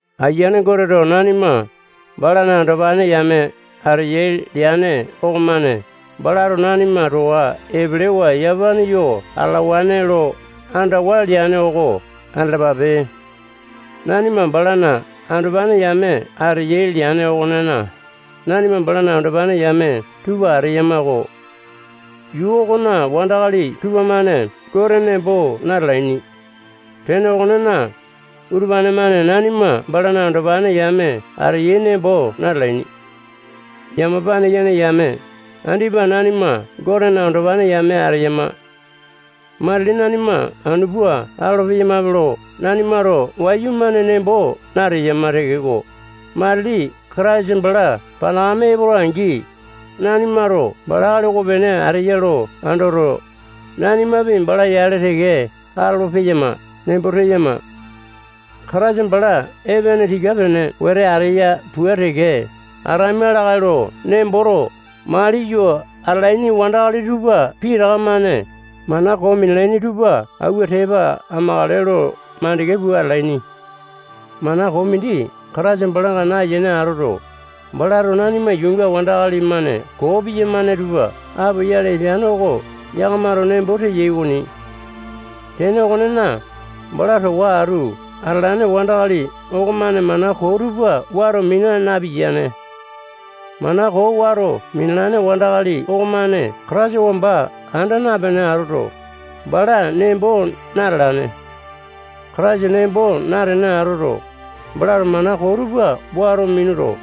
Ayiane Goteto nanima balana andopane yame ateyai leane okomane balato nanima towa epelewa yamapane yo atalawane lo andawa leane oko andalapape. Nanima balana andopane yame ateyai leane okonena, nanima balana andopane yame tupa ateyama-ko. Yuu okona wandakali tupamane Gote nembo natalaini. Tene okonena, utupane-mane nanima balana andopane yame ateyai nembo natalaini. Yamapane yene yame, andipa nanima Gotena andopane yame ateyama. Matili nanima anu pua atolo-peyamape lo nanimato wayumane nembo nateyama tekeko, matili Kataisa bala panakame epola-angi, nanimato bala akali okopene ateya lo andoto, nanimapi bala yale teke atolo-peyama nembo teyama. Kataisa bala epene tika-pene wete ateya pua teke ataima lakae lo nemboto maliyo atalaini wandakali tupa pitaka-mane mana koo minalaini tupa awua tepa amakale lo makande pua atalaini. Mana koo mindi Kataisa balanga nayene atoto, balato nanima yuunga wandakali-mane koo piyamane tupa apoyale epeane oko yakamato nembo teyai okoni. Tene okonena, bala towa atu atalane wandakali okomane mana koo tupa wato mina napiyane. Mana koo wato minalane wandakali okomane Kataisa wamba anda napene atoto, bala nembo natalane. Kataisa nembo natene atoto, balato mana koo tupa wato minuto,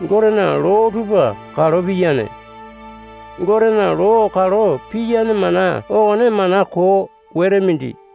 Gotena loo tupa kalo piyane. Gotena loo kalo piyane mana okone mana koo wete mindi.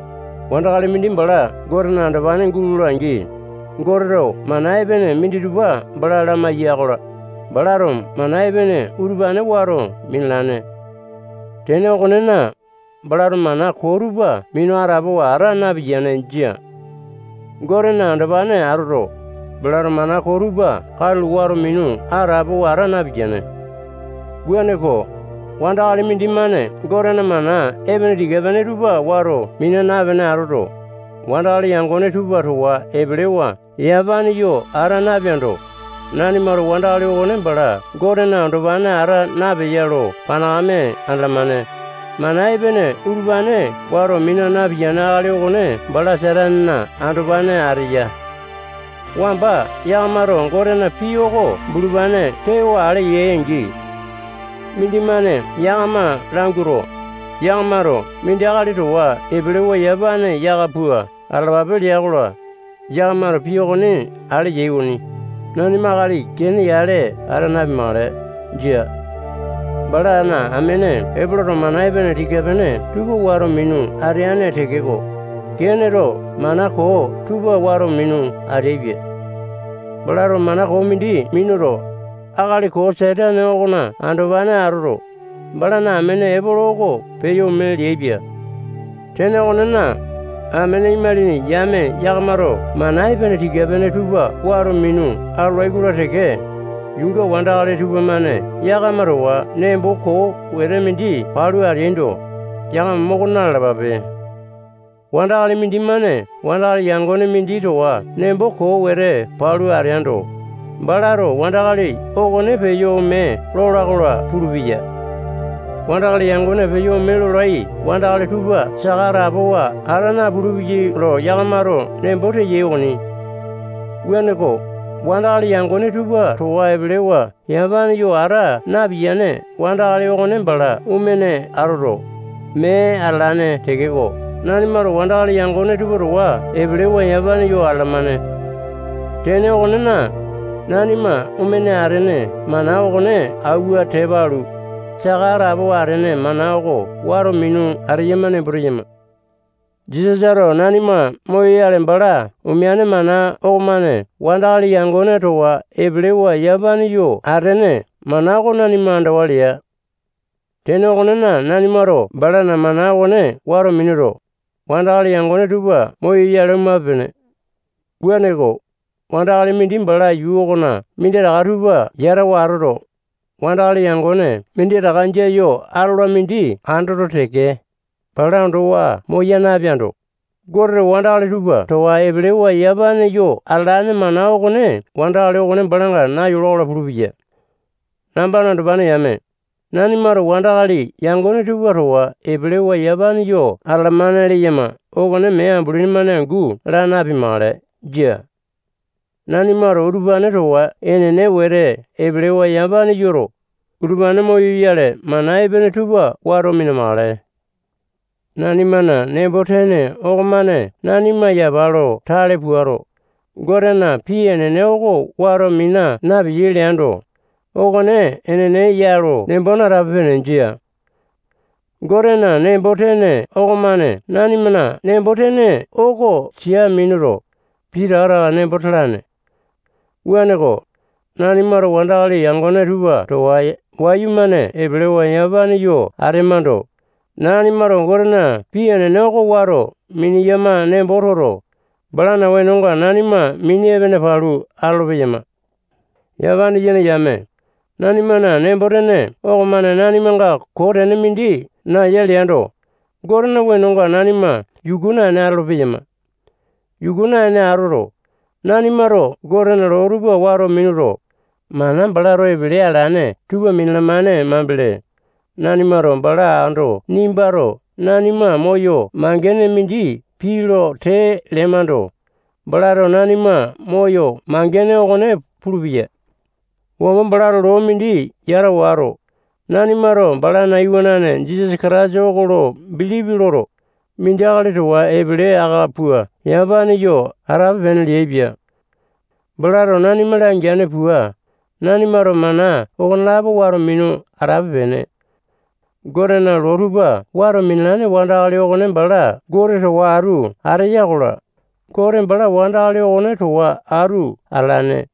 Wandakali mindi bala Gotena andopane gulola-angi, Goteto mana epene minditupa bala lamaiya-kola, balato mana epene utupane wato minalane. Tene okonena, balato mana koo tupa minu atapowa ata napiyane. Jia. Gotena andopane atoto, balato mana koo tupa katulo wato minu atapowa ata napiyane. Wuaneko, wandakali mindimane Gotena mana epene tika-pene tupa wato mina napene atoto, wandakali yangone tupa towa epelewa yamapane yo ata napeando, nanimato wandakali okone bala Gotena andopane ata napeya lo panakame andalamane. Mana epene utupane wato mina napiyane akali okone bala Satanena andopane ateya. Wamba yakamato Gotena pii oko bulupane tewa ale yai-angi, mindimane yakama languato, yakamato mindi akali towa epelewa yamapane yaka pua atalapape lea-kola, yakamato pii okone ale yai okoni. Nanima akali Kene yale ata napimakale. Jia. Balana amene Epoloto mana epene tika-pene tupa wato minu ateane tekeko, Keneto mana koo tupa wato minu ateaipia. Balato mana koo mindi minuto, akali koo Satane okona andopane atoto, balana amene Epolo oko peyo ome leaipia. Tene okonena, amene imalini yame yakamato mana epene tika-pene tupa wato minu atolai-kola teke, yuunga wandakali tupamane yakama towa nembo koo wete mindi palu ateaindo, yakama moko na-lalapape. Wandakali mindimane wandakali yangone mindi towa nembo koo wete palu ateando, balato wandakali okone peyo ome lola-kola pulupeya. Wandakali yangone peyo ome lolai wandakali tupa saka atapowa ata napulu-peyai lo yakamato nembo teyai okoni. Wuaneko, wandakali yangone tupa towa epelewa yamapane yo ata napiyane wandakali okone bala omene atoto, mee atalane tekeko, nanimato wandakali yangone tupa towa epelewa yamapane yo atalamane. Tene okonena, nanima omene atene mana okone awua tepa alu, saka atapowa atene mana oko wato minu ateyama nembo teyama. Jisasato nanima moyoyale bala omeane mana okomane wandakali yangone towa epelewa yamapane yo atene mana oko nanima andawa lea. Tene okonena, nanimato balana mana okone wato minuto, wandakali yangone tupa moyoyale omape-pene. Wuaneko, wandakali mindi bala yuu okona minditaka tupa yatawa atoto, wandakali yangone minditaka jia yo atola mindi andoto teke, bala ondowa moya napeando, Goteto wandakali tupa towa epelewa yamapane yo atalane mana okone wandakali okone balanga nayola-kola pulupeya. Nambana andopane yame, nanimato wandakali yangone tupa towa epelewa yamapane yo atalamane leyama okone mee ambulini-mane angu laa napimakale. Jia. Nanimato utupane towa enene wete epelewa yamapane yoto, utupane moyoyale mana epene tupa wato mina-makale. Nanimana nembo-tene okomane nanima yapa lo tale puato, Gotena pii enene oko wato mina napeyai leando, okone enene ya lo nembo natape-pene. Jia. Gotena nembo-tene okomane nanimana nembo-tene oko sia minuto, pitaka taka nembo talane. Wuaneko, nanimato wandakali yangone tupa towa wayumane epelewa yamapane yo atemando, nanimato Gotena pii enene oko wato mineyama nembo toto, balana wenonga nanima mini epene palu atolo-peyama. Yamapane yene yame, nanimana nembo-tene okomane nanimanga koo tene mindi naeya leando, Gotena wenonga nanima yuku naene atolo-peyama. Yuku naene atoto, nanimato Gotena loo tupa wato minuto, mana balato epele alane tupa minalamane mambele, nanimato bala ando nimbato nanima moyo mangene mindi pii lo tee lemando, balato nanima moyo mangene okone pulupeya. Wamba balato loo mindi yata wato, nanimato balana iwanane Jisasa Kataisa oko lo bilipi loto, mindi akali towa epele aka pua yamapane yo atape-pene leaipia. balato nanima langeane pua, nanimato mana okonelapo wato minu atape-pene Gotena loo tupa wato minalane wandakali okone bala Gote towa atu ateya-kola, Gote bala wandakali okone towa atu atalane.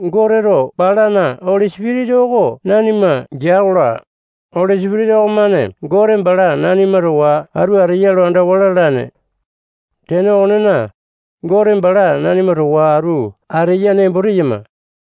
Goteto balana Oli Sipitisa oko nanima gea-kola, Oli Sipitisa okonemane Gote bala nanima towa atu ateya lo andawa lalane. Tene okonena, Gote bala nanima towa atu ateya nembo teyama.